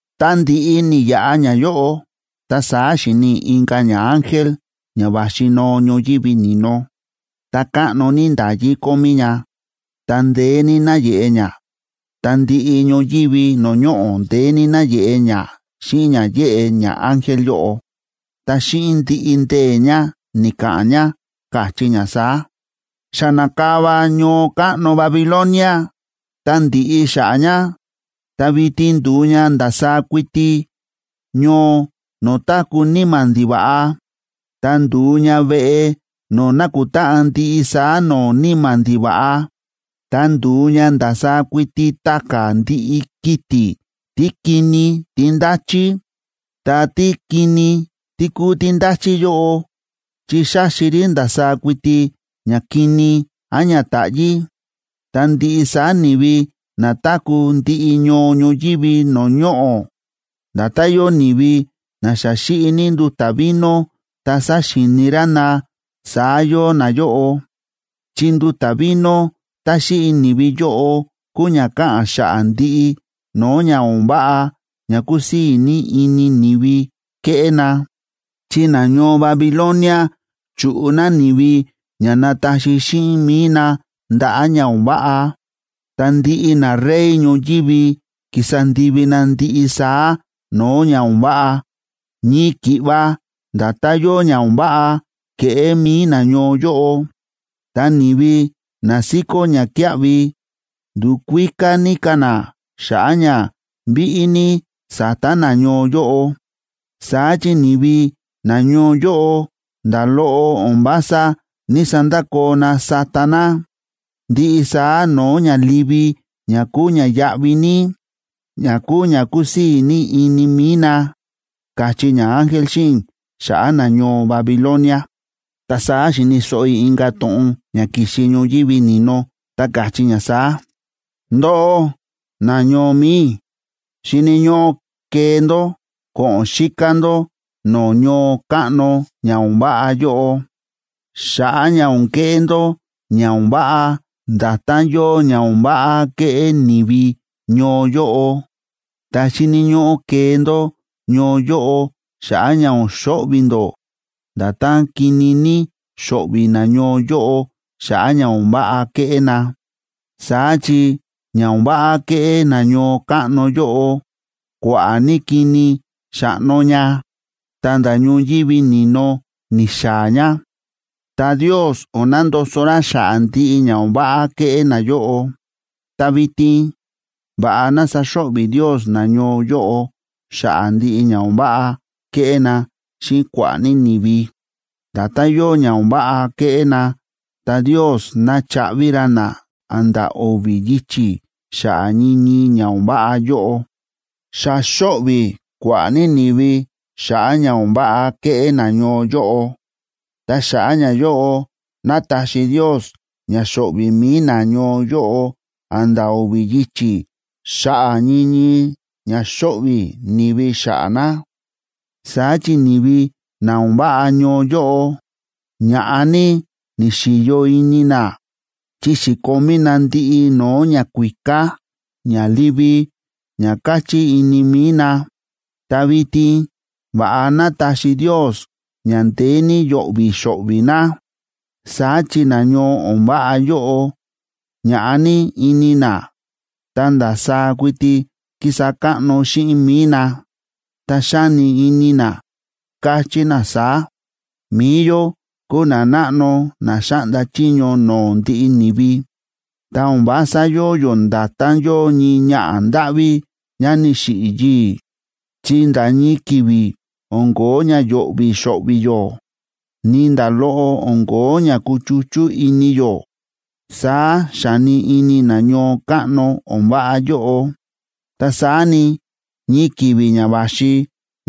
Ta ndi̱ꞌi ni̱yaꞌa ñayóꞌo, ta saá xi̱ni i̱ inka̱ ñaángel ña va̱xi noo ñoyívi ni̱no. Ta káꞌno ní nda̱yí kómí ña, ta ndeé ní náyeꞌe ña, ta ndiꞌi ñoyívi no̱o̱ ñoꞌo̱ ndeé ní náyeꞌe ña xíꞌin ña yéꞌe ñaángel yóꞌo. Ta xíꞌin ndiꞌi ndee̱ ña ni̱ka̱ꞌa̱n ña, káchí ña saá: ―¡Xa na̱kava ñoo káꞌno Babilonia, ta ndi̱ꞌi xa̱ꞌa̱ ña! Ta vitin ndu̱u ña ndasaá kuiti ñoo no̱o̱ táku̱ níma̱ ndiva̱ꞌa ta ndu̱u ña veꞌe no̱o̱ nákutáꞌan ndiꞌi saá no̱o̱ níma̱ ndiva̱ꞌa. Ta ndu̱u ña ndasaá kuiti ta̱ka̱ ndiꞌi kiti̱ tí kini tí ndáchí, ta tí kini ní kúu tí ndáchí yóꞌo, chi xáxi rí ndasaá kuiti ña kini án ña táꞌyí. Ta ndiꞌi saá ni̱vi na táku̱ ndiꞌi ñoo ñoyívi no̱o̱ ñoꞌo̱, nda̱tán yóo ni̱vi na xa xíꞌi ní nduta̱ vino ta sa̱xíini rá na, saá yóo nayóꞌo. Chi nduta̱ vino tá xíꞌi ni̱vi yóꞌo kúu ña káꞌa̱n xa̱ꞌa̱ ndiꞌi no̱o̱ ña o̱n váꞌa ña kúsii̱ ini ni̱vi kéꞌé na. Chi nañoo Babilonia chu̱ꞌu na ni̱vi ña nataxi xíꞌin mi̱i na ndaꞌa̱ ña o̱n váꞌa. Ta ndiꞌi narey ñoyívi ki̱sa ndivi na ndiꞌi saá no̱o̱ ña o̱n váꞌa, ñii ki̱ꞌva nda̱tán yóo ña o̱n váꞌa ke̱ꞌé mi̱i nañoo yóꞌo. Ta ni̱vi na síkó ñakíaꞌvi ndu̱kuíká ní ka̱ na xa̱ꞌa̱ ña víꞌí ní sa̱ta nañoo yóꞌo, saá chi ni̱vi nañoo yóꞌo nda̱ loꞌo o̱n vása ní‑sandakoo na sáta na ndiꞌi saá no̱o̱ ña livi ña kúu ña yáꞌví ní, ña kúu ña kúsii̱ ní ini mi̱i na ―káchí ñaángel xíꞌin i̱ xa̱ꞌa̱ nañoo Babilonia. Ta saá xi̱ni̱ so̱ꞌo i̱ inka̱ to̱ꞌon ña ki̱xi ñoyívi ni̱no, ta káchí ña saá: ―Ndóꞌó, nañoo mi̱i i̱, xíni̱ ñóꞌó kee ndó ko̱ꞌo̱n xíká ndó no̱o̱ ñoo káꞌno ña o̱n váꞌa yóꞌo xa̱ꞌa̱ ña o̱n keꞌé ndó ña o̱n váꞌa nda̱tán yóo ña o̱n váꞌa ke̱ꞌé ni̱vi ñoo yóꞌo. Ta xíni̱ ñóꞌó kee ndó ñoo yóꞌo xa̱ꞌa̱ ña o̱n xo̱ꞌvi̱ ndó, nda̱tán kini ní xo̱ꞌvi̱ nañoo yóꞌo xa̱ꞌa̱ ña o̱n váꞌa ke̱ꞌé na. Saá chi ña o̱n váꞌa ke̱ꞌé na ñoo káꞌno yóꞌo, kua̱ꞌa̱ ní kini xa̱ꞌno ña, ta̱nda̱ ñoyívi ni̱no ni̱xaa̱ ña. Ta Ndios o̱n nandoso ra xa̱ꞌa̱ ndiꞌi ña o̱n váꞌa ke̱ꞌé nayóꞌo. Ta vitin va̱ꞌa ná saxo̱ꞌvi̱ Ndios nañoo yóꞌo xa̱ꞌa̱ ndiꞌi ña o̱n váꞌa ke̱ꞌé na xíꞌin kua̱ꞌa̱ ní ni̱vi. Nda̱tán yóo ña o̱n váꞌa ke̱ꞌé na, ta Ndios ná chaꞌvi ra na a̱nda̱ o̱vi̱ yichi̱ xa̱ꞌa̱ ñii ñii ña o̱n váꞌa yóꞌo. Xa xo̱ꞌvi̱ kua̱ꞌa̱ ní ni̱vi xa̱ꞌa̱ ña o̱n váꞌa ke̱ꞌé nañoo yóꞌo. Ta xa̱ꞌa̱ ñayóꞌo, ná taxi Ndios ña xo̱ꞌvi̱ mi̱i nañoo yóꞌo a̱nda̱ o̱vi̱ yichi̱ xa̱ꞌa̱ ñii ñii ña xo̱ꞌvi̱ ni̱vi xa̱ꞌa̱ na. Saá chi ni̱vi na o̱n váꞌa ñoo yóꞌo, ña̱ꞌa ní ni̱xi̱yo ini na, chi xi̱komí na ndiꞌi no̱o̱ ñakuíká ña livi ña káchí ini mi̱i na. Ta vitin va̱ꞌa ná taxi Ndios ña ndeé ní yo̱ꞌvi̱ xo̱ꞌvi̱ na. Saá chi nañoo o̱n váꞌa yóꞌo, ña̱ꞌa ní ini na, ta ndasaá kuiti ki̱sa káꞌno xíꞌin mi̱i na, ta xáni ini na, káchí na saá: “Mi̱i yó kúu nanáꞌno na xáꞌnda chiño no̱o̱ ndiꞌi ni̱vi. Ta o̱n vása yóo yó nda̱tán yóo ñii ñaꞌa̱ ndáꞌví ñá ni̱xiꞌi̱ yii̱, chi nda̱ ñii ki̱vi̱ o̱n kóo ña yo̱ꞌvi̱ xo̱ꞌvi̱ yó, ni nda̱ loꞌo o̱n kóo ña kuchuchú ini yó”, saá xáni ini na ñoo káꞌno o̱n váꞌa yóꞌo. Ta saá ni, ñii ki̱vi̱ ña va̱xi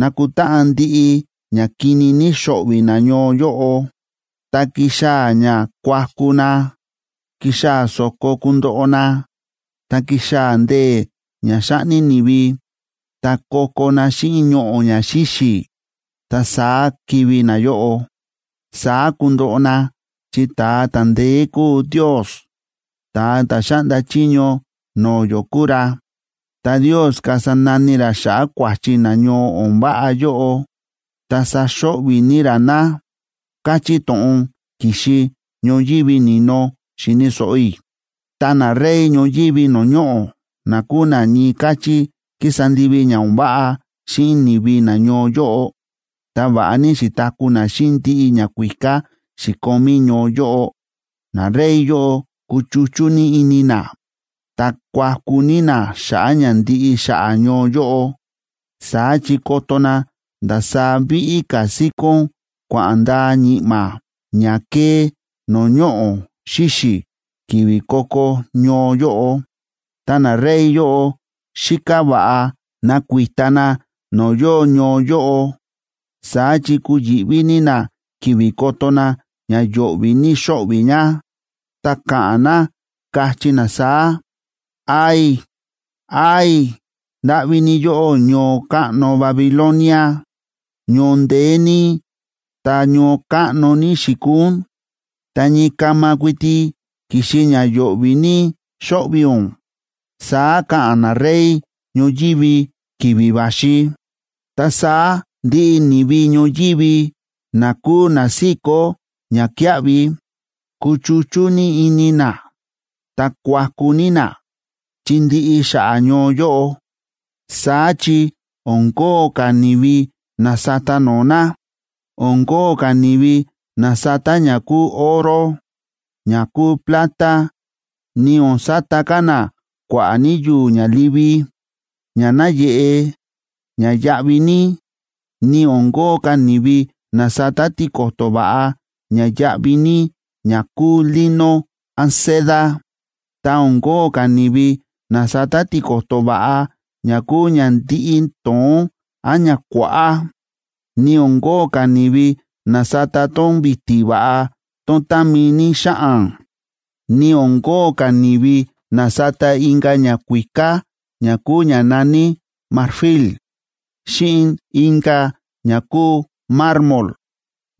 nakutáꞌan ndiꞌi ña kini ní xo̱ꞌvi̱ nañoo yóꞌo, ta kixaa̱ ña kuaku na, kixaa̱ so̱ko kundoꞌo na, ta kixaa̱ ndee̱ ña xáꞌni ni̱vi, ta ko̱ko̱ na xíꞌin ñoꞌo̱ ña xíxi̱, ta saá kivi̱ nayóꞌo. Saá kundoꞌo na, chi ta̱a ta̱ ndeé kúu Ndios, ta̱a ta̱ xáꞌnda chiño no̱o̱ yó kúu ra, ta Ndios kasa nani ra xa̱ꞌa̱ kua̱chi nañoo o̱n váꞌa yóꞌo, ta saxo̱ꞌvi̱ ní ra na ―káchí to̱ꞌon ki̱xi ñoyívi ni̱no xi̱ni̱ so̱ꞌo i̱. Ta narey ñoyívi no̱o̱ ñoꞌo̱, na kúu na ñii káchí ki̱sa ndivi ña o̱n váꞌa xíꞌin ni̱vi nañoo yóꞌo, ta va̱ꞌa ní xi̱taku̱ na xíꞌin ndiꞌi ñakuíká xi̱komí ñoo yóꞌo, narey yóꞌo kuchuchú ní ini na, ta kuaku ní na xa̱ꞌa̱ ña ndiꞌi xa̱ꞌa̱ ñoo yóꞌo. Saá chi koto na ndasaá víꞌí ka̱ síkón kua̱ꞌa̱n ndaa ñi̱ꞌma̱ ña kée no̱o̱ ñoꞌo̱ xíxi̱ ki̱vi̱ ko̱ko̱ ñoo yóꞌo. Ta narey yóꞌo xíká va̱ꞌa nakuita na no̱o̱ yóo ñoo yóꞌo, saá chi kuyi̱ꞌví ní na ki̱vi̱ koto na ña yo̱ꞌvi̱ ní xo̱ꞌvi̱ ña, ta ka̱ꞌa̱n na, kachí na saá: ―¡Ay! ¡Ay! ¡Ndáꞌví ní yóꞌó ñoo káꞌno Babilonia! ¡Ñoo ndeé ní, ta ñoo káꞌno ní xi̱kuu ún! ¡Ta ñii kama kuiti ki̱xi ña yo̱ꞌvi̱ ní xo̱ꞌvi̱ ún! ―saá ka̱ꞌa̱n narey ñoyívi ki̱vi̱ va̱xi. Ta saá ndiꞌi ni̱vi ñoyívi na kúu na síkó ñakíaꞌvi, kuchuchú ní ini na, ta kuaku ní na, chi ndi̱ꞌi xa̱ꞌa̱ ñoo yóꞌo. Saá chi o̱n kóo ka̱ ni̱vi na sata no̱o̱ na. O̱n kóo ka̱ ni̱vi na sata ña kúu oro, ña kúu plata, ni o̱n sata ka̱ na kua̱ꞌa̱ ní yu̱u̱ ña livi, ña náyeꞌe, ña yáꞌví ní. Ni o̱n kóo ka̱ ni̱vi na sata tiko̱to̱ va̱ꞌa ña yáꞌví ní ña kúu lino án seda. Ta o̱n kóo ka̱ ni̱vi na sata tiko̱to̱ va̱ꞌa ña kúu ña ndíꞌí to̱ón án ña kuáꞌá. Ni o̱n kóo ka̱ ni̱vi na sata tón vi̱ti̱ va̱ꞌa tón támi ní xáꞌan, ni o̱n kóo ka̱ ni̱vi na sata inka̱ ñakuíká ña kúu ña na̱ní marfil, xíꞌin inka̱ ña kúu mármol.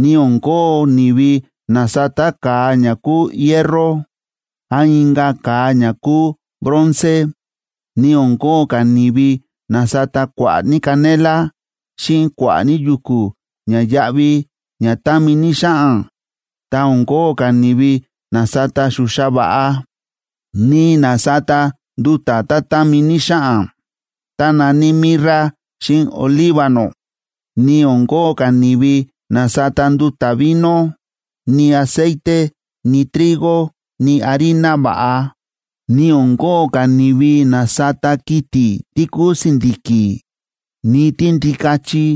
Ni o̱n kóo ni̱vi na sata ka̱a ña kúu hierro, án inka̱ ka̱a ña kúu bronce. Ni o̱n kóo ka̱ ni̱vi na sata kua̱ꞌa̱ ní canela, xíꞌin kua̱ꞌa̱ ní yu̱ku̱ ña yáꞌví ña támi ní xáꞌan. Ta o̱n kóo ka̱ ni̱vi na sata xuxa va̱ꞌa, ni na sata nduta̱ tá támi ní xáꞌan, tá na̱ní mirra xíꞌin olíbano. Ni o̱n kóo ka̱ ni̱vi na sata nduta̱ vino, ni aceite, ni trigo, ni harina va̱ꞌa. Ni o̱n kóo ka̱ ni̱vi na sata kiti̱ tí kúu si̱ndi̱ki̱, ni tíndikachi,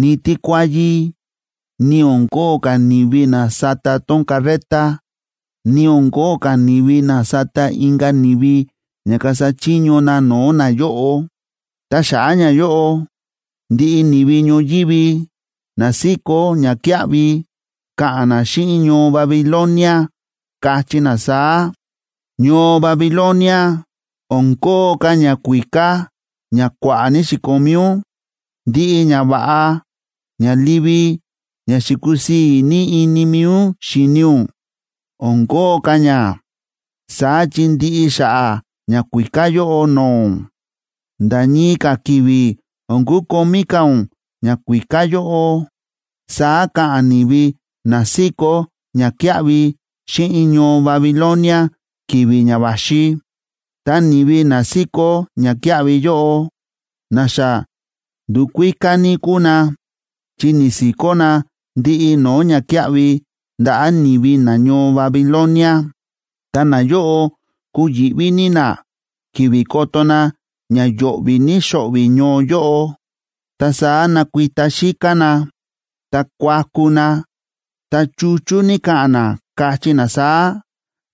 ni tíkuáyí, ni o̱n kóo ka̱ ni̱vi na sata tón carreta. Ni o̱n kóo ka̱ ni̱vi na sata inka̱ ni̱vi ña kasa chiño na no̱o̱ nayóꞌo. Ta xa̱ꞌa̱ ñayóꞌo, ndiꞌi ni̱vi ñoyívi na síkó ñakíaꞌvi, ka̱ꞌa̱n na xíꞌin ñoo Babilonia, kachí na saá: ―Ñoo Babilonia, o̱n kóo ka̱ ñakuíká ña kua̱ꞌa̱ ní xi̱komí ún. Ndiꞌi ñava̱ꞌa ña livi ña xi̱kusii̱ ní ini mi̱i ún xíni ún, o̱n kóo ka̱ ña. Saá chi ndi̱ꞌi xa̱ꞌa̱ ñakuíká yóꞌo no̱o̱ ún, nda̱ ñii ka̱ ki̱vi̱ o̱n kukomí ka̱ ún ñakuíká yóꞌo ―saá ka̱ꞌa̱n ni̱vi na síkó ñakíaꞌvi xíꞌin ñoo Babilonia ki̱vi̱ ña va̱xi. Ta ni̱vi na síkó ñakíaꞌvi yóꞌo, na xa ndu̱kuíká ní kúu na, chi ni̱si̱kó na ndiꞌi no̱o̱ ñakíaꞌvi ndaꞌa̱ ni̱vi nañoo Babilonia, ta nayóꞌo kuyi̱ꞌví ní na ki̱vi̱ koto na ña yo̱ꞌvi̱ ní xo̱ꞌvi̱ ñoo yóꞌo. Ta saá nakuita xíká na, ta kuaku na, ta chuchú ní ka̱ꞌa̱n na, kachí na saá: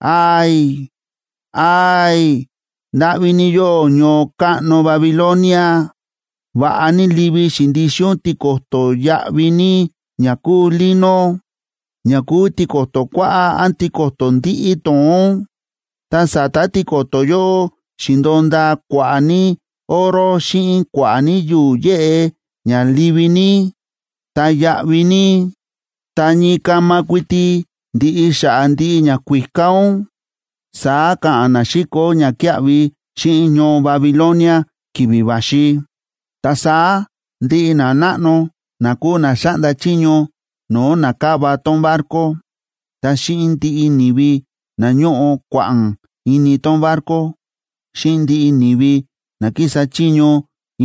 ―¡Ay! ¡Ay! ¡Ndáꞌví ní yóꞌó ñoo káꞌno Babilonia! Va̱ꞌa ní livi xi̱ndixin ún tiko̱to̱ yáꞌví ní ña kúu lino, ña kúu tiko̱to̱ kuáꞌá án tiko̱to̱ ndíꞌí to̱ón. Ta sa̱ta̱ tiko̱to̱ yóꞌo xi̱ndo̱o ndaa kua̱ꞌa̱ ní oro xíꞌin kua̱ꞌa̱ ní yu̱u̱ yéꞌe ña livi ní, ta yáꞌví ní. ¡Ta ñii kama kuiti ndi̱ꞌi xa̱ꞌa̱ ndiꞌi ñakuíká ún! ―saá ka̱ꞌa̱n na síkó ñakíaꞌvi xíꞌin ñoo Babilonia ki̱vi̱ va̱xi. Ta saá ndiꞌi nanáꞌno na kúu na xáꞌnda chiño no̱o̱ na káva tón barco, ta xíꞌin ndiꞌi ni̱vi na ñóꞌo kua̱ꞌa̱n ini tón barco, xíꞌin ndiꞌi ni̱vi na kísa chiño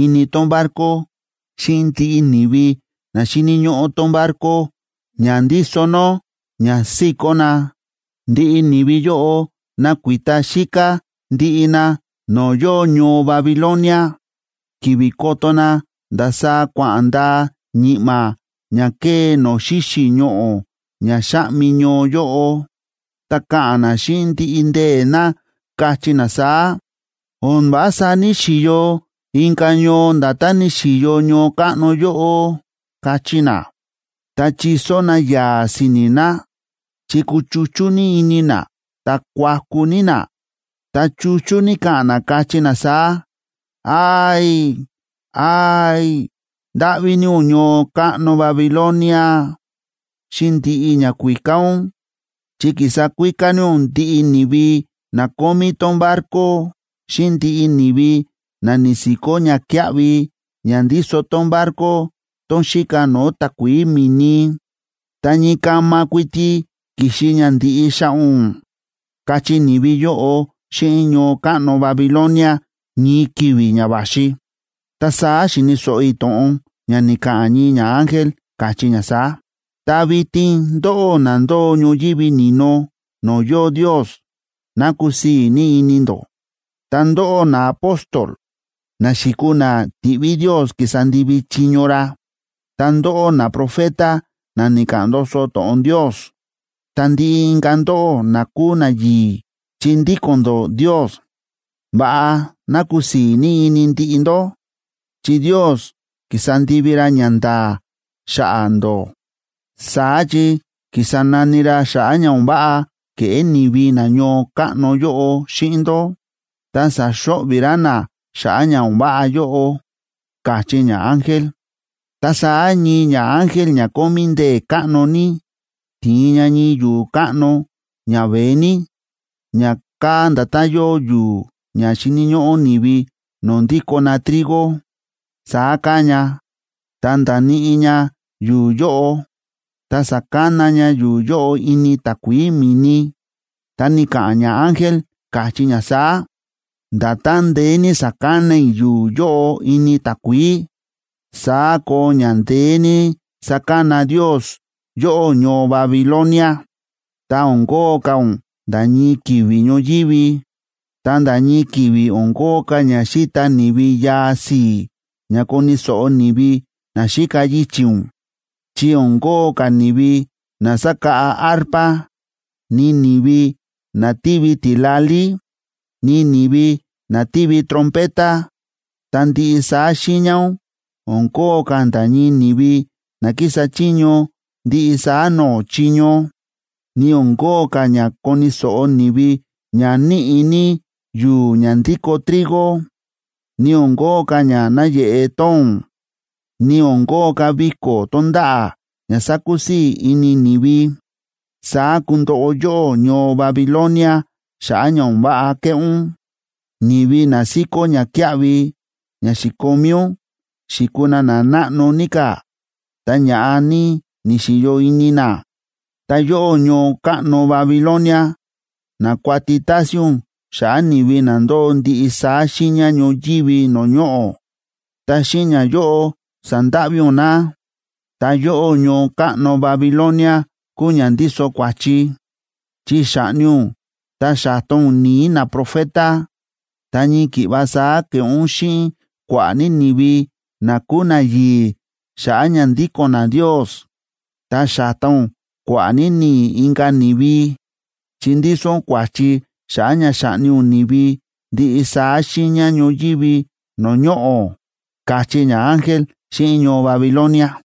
ini tón barco, xíꞌin ndiꞌi ni̱vi na xíni̱ ñóꞌó tón barco ña ndíso nó ña síkó na, ndiꞌi ni̱vi yóꞌo nakuita xíká ndiꞌi na no̱o̱ yóo ñoo Babilonia. Ki̱vi̱ koto na ndasaá kua̱ꞌa̱n ndaa ñi̱ꞌma̱ ña kée no̱o̱ xíxi̱ ñoꞌo̱ ña xáꞌmi ñoo yóꞌo, ta ka̱ꞌa̱n na xíꞌin ndiꞌi ndee̱ na, kachí na saá: ―O̱n vása ní‑xiyo inka̱ ñoo nda̱tán ni̱xi̱yo ñoo káꞌno yóꞌo ―kachí na. Ta chiso na yaa̱ si̱ni̱ na, chi kuchuchú ní ini na, ta kuaku ní na, ta chuchú ní ka̱ꞌa̱n na, kachí na saá: ―¡Ay! ¡Ay! ¡Ndáꞌví ní ún ñoo káꞌno Babilonia, xíꞌin ndiꞌi ñakuíká ún! Chi ki̱sa kuíká ní ún ndiꞌi ni̱vi na kómí tón barco xíꞌin ndiꞌi ni̱vi na ni̱si̱kó ñakíaꞌvi ña ndíso tón barco, tón xíka no̱o̱ takuií mi̱ni. ¡Ta ñii kama kuiti ki̱xi ña ndi̱ꞌi xa̱ꞌa̱ ún! ―kachí ni̱vi yóꞌo xíꞌin ñoo káꞌno Babilonia ñii ki̱vi̱ ña va̱xi. Ta saá xi̱ni̱ so̱ꞌo i̱ to̱ꞌon ña ni̱ka̱ꞌa̱n ñii ñaángel, káchí ña saá: ―Ta vitin ndóꞌó na ndóo ñoyívi ni̱no no̱o̱ yóo Ndios, ¡ná kusii̱ ní ini ndó! Ta ndóꞌó naapóstol, na xi̱kuu na ti̱ꞌví Ndios ki̱sa ndivi chiño ra, ta ndóꞌó naprofeta, na ni̱ka̱ꞌa̱n ndoso to̱ꞌon Ndios, ta ndiꞌi inka̱ ndóꞌó na kúu nayi̱i̱ chi ndíko̱n ndó Ndios, ¡va̱ꞌa ná kusii̱ ní ini ndiꞌi ndó!, chi Ndios ki̱sa ndivi ra ñanda̱a̱ xa̱ꞌa̱ ndó. Saá chi ki̱sa nani ra xa̱ꞌa̱ ña o̱n váꞌa ke̱ꞌé ni̱vi na ñoo káꞌno yóꞌo xíꞌin ndó, ta sa̱xo̱ꞌvi̱ ra na xa̱ꞌa̱ ña o̱n váꞌa yóꞌo ―káchí ñaángel. Ta saá ñii ñaángel ña kómí ndee̱ káꞌno ní ti̱in ña ñii yu̱u̱ káꞌno ña veé ní, ña káa nda̱tán yóo yu̱u̱ ña xíni̱ ñóꞌó ni̱vi no̱o̱ ndikó na trigo, saá káa ña. Ta nda̱níꞌi ña yu̱u̱ yóꞌo, ta sa̱kana ña yu̱u̱ yóꞌo ini takuií mi̱ni, ta ni̱ka̱ꞌa̱n ñaángel, káchí ña saá: ―Nda̱tán ndeé ní sa̱kana i̱ yu̱u̱ yóꞌo ini takuií, saá koo ña ndeé ní sakana Ndios yóꞌó ñoo Babilonia, ta o̱n kóo ka̱ ún nda̱ ñii ki̱vi̱ ñoyívi. Ta nda̱ ñii ki̱vi̱ o̱n kóo ka̱ ña xíta ni̱vi yaa si̱i̱ ña koni̱ so̱ꞌo ni̱vi na xíka yichi̱ ún, chi o̱n kóo ka̱ ni̱vi na sákáꞌa arpa, ni ni̱vi na tívi tila̱lí, ni ni̱vi na tívi trompeta. Ta ndiꞌi saá xiiña ún, o̱n kóo ka̱ nda̱ ñii ni̱vi na kísa chiño ndiꞌi saá no̱o̱ chiño, ni o̱n kóo ka̱ ña koni̱ so̱ꞌo ni̱vi ña níꞌi̱ ní yu̱u̱ ña ndíko trigo. Ni o̱n kóo ka̱ ña náyeꞌe tóo̱n, ni o̱n kóo ka̱ viko̱ tonda̱ꞌa̱ ña sakusii̱ ini ni̱vi. Saá kundoꞌo yóꞌó ñoo Babilonia xa̱ꞌa̱ ña o̱n váꞌa ke̱ꞌé ún. Ni̱vi na síkó ñakíaꞌvi ña xi̱komí ún xi̱kuu na nanáꞌno ní ka̱, ta ña̱ꞌa ní ni̱xi̱yo ini na. Ta yóꞌó ñoo káꞌno Babilonia na̱kuati tásín ún xa̱ꞌa̱ ni̱vi na ndóo ndiꞌi saá xiiña ñoyívi no̱o̱ ñoꞌo̱, ta xíꞌin ñayóꞌo sa̱ndáꞌví ún na. Ta yóꞌó ñoo káꞌno Babilonia kúu ña ndíso kua̱chi, chi xa̱ꞌni ún ta xa̱ta ún ni̱i̱ naprofeta. Ta ñii ki̱ꞌva saá ke̱ꞌé ún xíꞌin kua̱ꞌa̱ ní ni̱vi na kúu nayi̱i̱ xa̱ꞌa̱ ña ndíko̱n na Ndios. Ta xa̱ta ún kua̱ꞌa̱ ní ni̱i̱ inka̱ ni̱vi, chi ndíso ún kua̱chi xa̱ꞌa̱ ña xa̱ꞌni ún ni̱vi ndiꞌi saá xiiña ñoyívi no̱o̱ ñoꞌo̱ ―káchí ñaángel xíꞌin ñoo Babilonia.